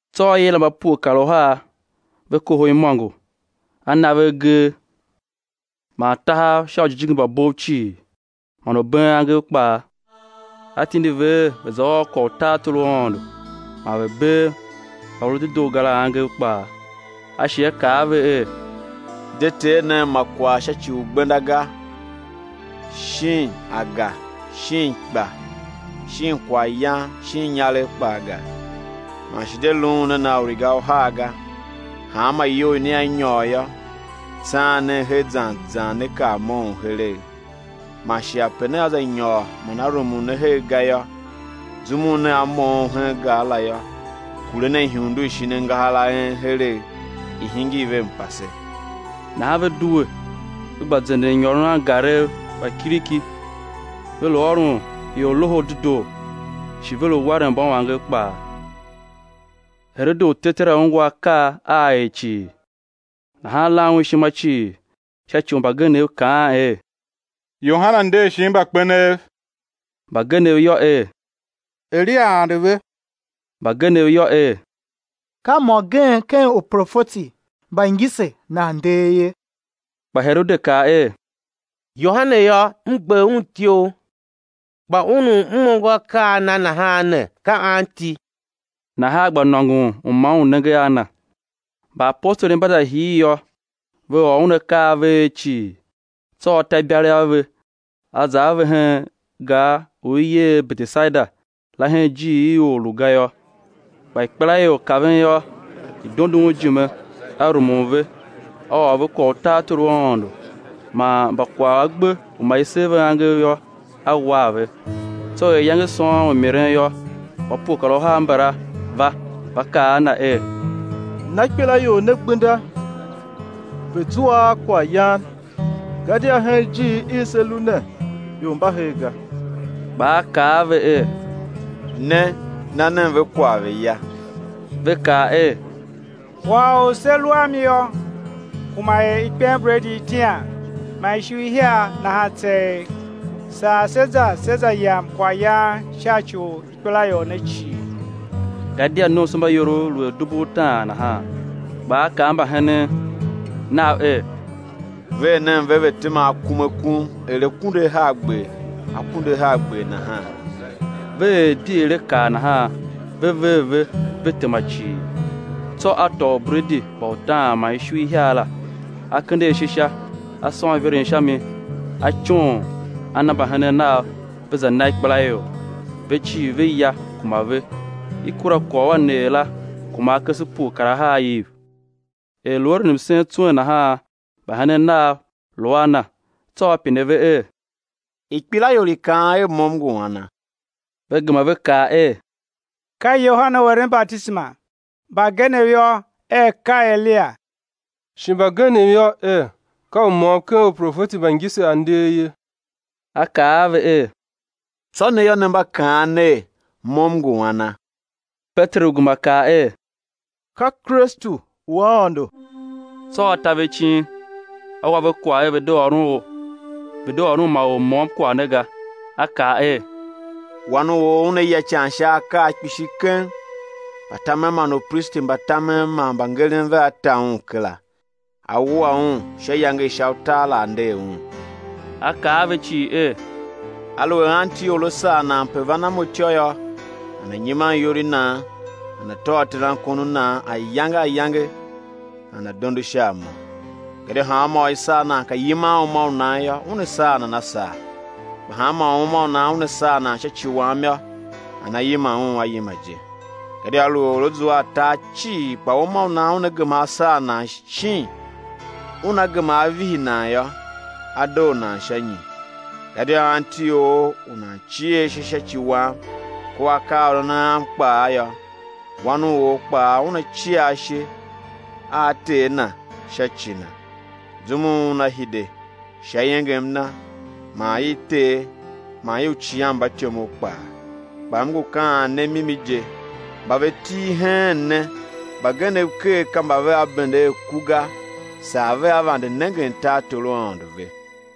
Tsô A yila mba pue kar uhar, ve kohol imôngo, A na ve agee man tahav sha ujijingi mba bov cii, man u been angev kpaa. A tindi ve er ve̱ za ôr kwagh u tartor u Aôndo man ve̱ bee mba ve lu dedoo ga la angev kpaa. A shi A kaa a ve er: De tee nen ma kwagh sha ci u gbenda ga, shin aga, shin ikpa, shin kwaghyan, shin inyaregh kpaa ga, man shi de luun nen a uriga uhar ga. Hanma iyou i nea nyôr yô, tsaan nen her zan zan né kar moughon heregh. Man shi ape nea za nyôr man a rumun ne her ga yô, zum u nea moughon hen gar la yô, kure nen ihundu i shin angahar a en heregh, i̱ hingir ve mpase. Nahan ve due ve gba zenden nyôron angarev mba kiriki, ve lu ôron ior Loho u Dedoo, shi ve lu waren mbauangev kpaa. Herode u tetera ungwa akaa a A er cii nahan lan un ishima cii sha ci u mbagenev kaan er, Yohane nder shin mbakpenev; mbagenev yô, er, Eliya ande ve; mbagenev yô, er, ka mô gen ken uprofeti mba ngise nan nder ye. Kpa Herode kaa er: Yohane yô, m gber un ityough; kpa Un u m ongo akaa a Na nahan ne ka anti? Nahan a gba nôngon u ma un nenge a Na. Mbaapostoli mba za hir yô, ve ôr Un akaa a ve er cii. Tsô A ta ibalegh a ve A za a ve hen gar u i yer er Betesaida la hen ijiir i or lu ga yô. Kpa ikpelaior kaven yô, i dondo Un ijime; A rumun ve, A ôr ve kwagh u tartor u Aôndo; man mba kwagh a gbe u ma i ser ve angev yô, A war ve. Tsô er iyange sôôn u miren yô, mba pue kar uhar mbala va, va kaa a Na er: Na ikpelaior ne gbenda, ve̱ zua a kwaghyan, gadia hen ijiir i se lu ne ior mba her ga. Kpa A kaa a ve er: Ne, na nen ve kwagh ve̱ ya. Ve kaa er: Kwagh u se lu a mi yô, kuma er ikpenbredi itian man ishu ihiar nahan tseegh, saa sé za sé za yam kwaghyan sha ci u ikpelaior ne cii. Gadia nomsombaiorov lu er dubu utaan nahan. Kpa A kaa a mbahenen Nav er: Ver nen ve, ve̱ tema akum akum er akunduahargber, akunduahargber nahan. Ve er di er A kaa nahan, ve ver ve, ve tema cii. Tsô A tôô ubredi mba utaan man ishu ihiar la, A kende ashe sha, A sôn iveren sha mi, A coon, A na mbahenen Nav, ve za na ikpelaior. Ve cii ve ya, kuma ve; i kura kwagh u a neer la, kuma akese pue kar ahar iv. Er lu eren msen tswen nahan, mbahenen Nav lu a Na; tsô A pine ve er: Ikpelaior i kaan er, Mo M ngu ana? Ve gema ve kaa er: Ka Yohane u eren batisema; mbagenev yô, er ka Eliya; shi mbagenev yô, er, ka u môm ken uprofeti mba ngise a nder ye. A kaa a ve er: Tsô ne yô, ne mba kaan ner: Mo, M ngu ana? Peteru gema kaa er: Ka Kristu u Aôndo. Tsô A ta ve icin, A wa ve kwagh er ve̱ de ôron ma or môm kwagh ne ga. A kaa er: Wan u or Una ya ican sha akaa kpishi keng, mbatamen man upristi mba tamen man mbangeren vea ta Un kera, á wua Un; sha iyange i sha utar la á nder Un. A kaa a ve cii er: Aluer anti or a sar nan pe van a Mo ityô yô, nana̱ nyiman iyol i nan, nana̱ tôô terankon u nan ayange ayange, nana̱ dondo sha a Mo. Gadia hanmô u i sar nan ka yiman uma u nan yô, una saa nan a saa; kpaa hanmô u uma u nan una saa sha ci Wam yô, nana yima Un a yima je. Gadia aluer or á zua a tar cii kpa uma u nan una gema á saa nan shin una gema á vihi nan yô, á doo nan sha nyi? Gadia anti or u nan cie ashe sha ci Wam kua akaaôron Am kpaa yô, Wan u or kpaa Una cia ashe a Ter Na sha ci u nan, zum u Una hide sha iengem Na man i Ter man i uicighanmbatyomov kpaa. Kpa M ngu kaan ne mimi je, mba ve til heen ne mbagenev ker ka mba vea bende a ku ga saa vea vande nengen tartor u Aôndo ve.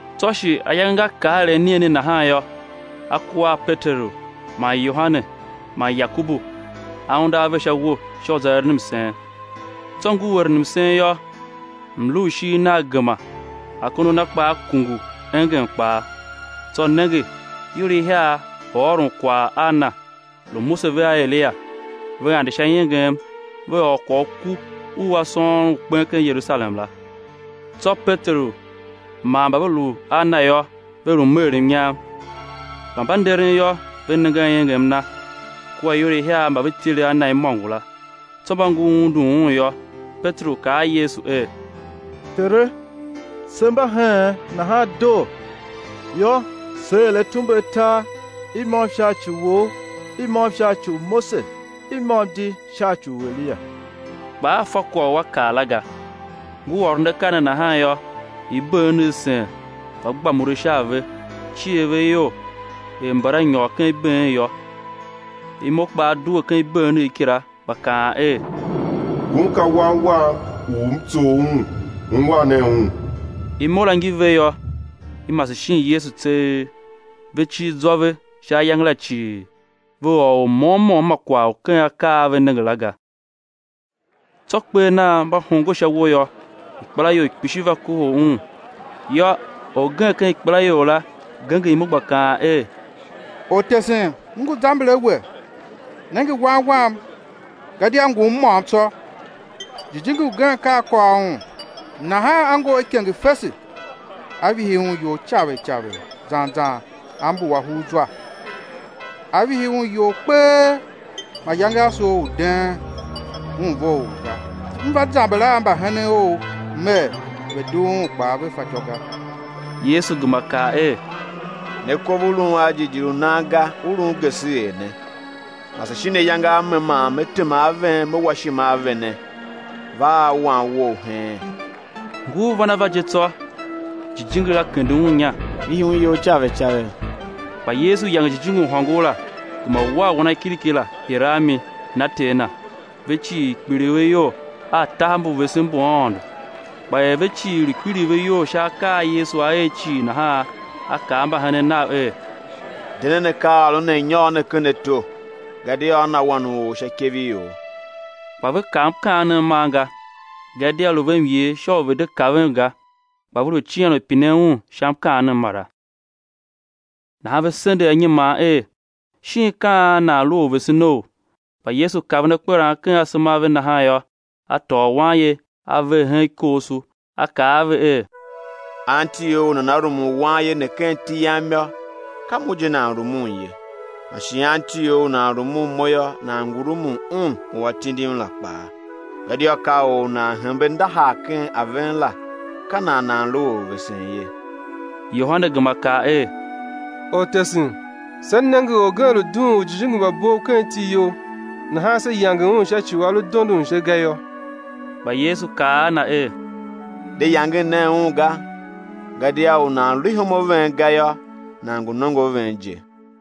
Tsô shi ayange nga kar er anigheni nahan yô, A kua a Peteru man Yohane man Yakobu, A unde a ve sha uwo sha u za eren msen. Tsô ngur eren msen yô, mlu u ishigh Nagh gema, akondo a Na kpaa kungu, engem kpaa. Tsô nenge, ior ihiar lu ôron kwagh a Na, lu Mose vea Eliya; ve ande sha iengem, ve ôr kwagh u ku u A sôôn u kpen ken Yerusalem la. Tsô Peteru man mba ve lu a Na yô, ve lu meer mnyam; kpa mba nderen yô, ve nenge a iengem Na, kua ior ihiar mba ve tile a Na imôngo la. Tsô mba ngur undun Un yô, Peteru kaa a Yesu er: Tere, se mba heen, nahan doo; yô, sé er atumbe atar, i môm sha ci Wou, i môm sha ci u Mose, i môm di sha ci u Eliya; kpa a fa kwagh u a kaa la ga. Ngur ôron akaa ne nahan yô, ibeenegh sen, va gba mure sha a ve; cier ve iyol er mbala nyôr ken ibeen yô. Imo kpaa due ken ibeenegh kila, gba kaan er: Ngun ka Wan Wam u M tsough Un, ungwan nen Un. Imo la ngi ve yô, i mase shin Yesu tseegh. Ve cir zwa ve sha ayange la cii, ve ôr or môm môm ma kwagh u ken akaa a ve nenge la ga. Tsô kper nan mba hongo sha uwo yô, ikpelaior kpishi va kohol Un. Yô, orgen ken ikpelaior la genger imo gba kaan er: Ortesen m ngu zamber a We, nenge wan wam, gadia ngum môm tsô. Jijingi ugen ka a kôr un, nahan a ngor ikenge fese, a vihi un iyol caver caver zan zan a mbuwa hugh zwa, a vihi un iyol kpee, mayange a soo u deen un vough ga. M va zamber a mbahenen Ou mer, ve̱ dugh un, kpaa ve fatyô ga. Yesu gema kaa er: Ne kov u lun a jighjigh u nan ga, u lun geseghee ne, mase shin ayange a me man Me tema a ven, Me wa ishima a vene? Va a wan wou heen. Ngur van a va je tsô, jijingi la kende un inya, vihi un iyol caver caver. Kpa Yesu yange jijingi u hôngor la, gema war wanakiriki la, hire a mi, na ter na. Ve cii kpiligh ve iyol a tahav mbu vesen mbu Aôndo. Kpa er ve cii lu kpiligh ve iyol sha akaa a Yesu A er cii nahan, A kaa a mbahenen Nav er: De nen, akaaôron ne a̱ nyôr ne ken ato, gadia á na Wan u or sha ikev i ior. Kpa ve kav mkaanem man ga gadia lu ve myer sha u ve̱ de kaven ga; kpa ve lu cian u pinen Un sha mkaanem mara. Nahan ve sendegh anyiman er, shin ka an nan lu orvesenou? Kpa Yesu kaven akperan ken asema a ve nahan yô, A tôô wanye A ver hen ikooso, A kaa a ve er: Anti or u nana rumun wanye ne ken iti Yam yô, ka Mo je nan rumun ye, man shi anti or u nan rumun Mo yô, nan ngu rumun Un u A tindim la kpaa. Gadia ka or u nan hembe ndahar ken a ven la, ka nan nan lu orvesen ye. Yohane gema kaa er: Ortesen, se nenge orgen lu dughun ujijingi mba bov ken iti You, nahan se yange un sha ci u a lu dondon se ga yô. Kpa Yesu kaa a na er: De yangen nen un ga, gadia U nan lu ihom a ven ga yô, nan ngu nongo a ven je.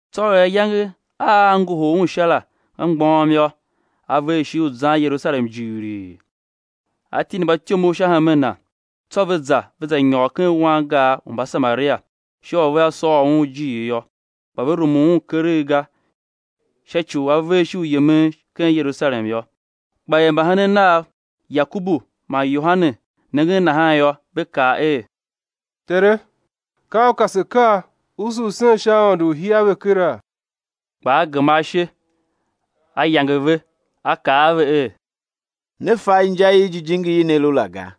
Tsô er ayange a á ngohol Un Sha la nga mgbôghom yô, A ver ishigh u zan Yerusalem jighilii, A tindi mbatyomov sha hemen Na; tsô ve za ve za nyôr ken wangar u Mbasamaria sha u vea sôr Un ijiir yô. Kpa ve rumun Un keregh ga sha ci u A ver ishigh u yemen ken Yerusalem yô. Kpa er mbahenen Nav, Yakobu man Yohane, nenge nahan yô, ve kaa er: Tere, ka U ka se̱ kaa, usu u̱ sen sha aôndo u̱ hia ve kera? Kpa A gema ashe, A yange ve A kaa a ve er: Ne fa inja i jijingi i ne lu la ga;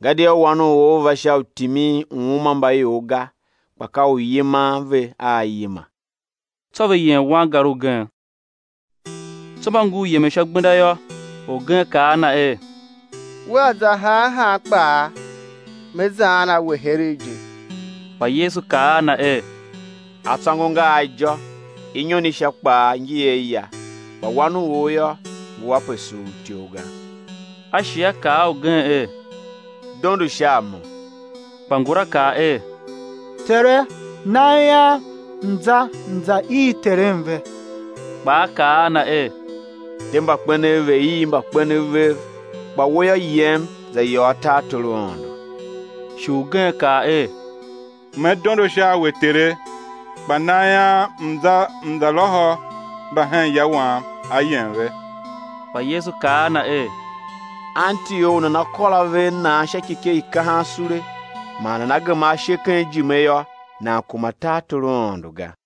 gadia Wan u or va sha u timin uuma mba ior ga, kpa ka u yiman ve a yima. Tsô ve yem wangar ugen. Tsô mba ngur yemen sha gbenda yô, orgen kaa a Na er: Wea za han han kpaa, me zaan a We heregh je! Kpa Yesu kaa a na er: Atsôngo nga a ijô, inyon i sha kpaa ngi a aya; kpa Wan u or yô, ngu ape suur ityough ga. A shi A kaa a ugen er: Dondo sha a Mo. Kpa ngula kaa er: Tere, nam ian m̱ za m̱ za ii terem ve. Kpa A kaa a na er: De, mbakpenev ve̱ ii mbakpenev vev; kpa we yô, yem, za yôô tartor u Aôndo. Shi ugen kaa er: Me dondo sha a We Tere, kpa nam ian m̱ za m̱ za lôhô mba hen ya wam ayem ve. Kpa Yesu kaa a na er: Anti or u nana kôr ave a nan sha ikyekye i kahan sule, man nana geman ashe ken ijime yô, nan kuma tartor u Aôndo ga.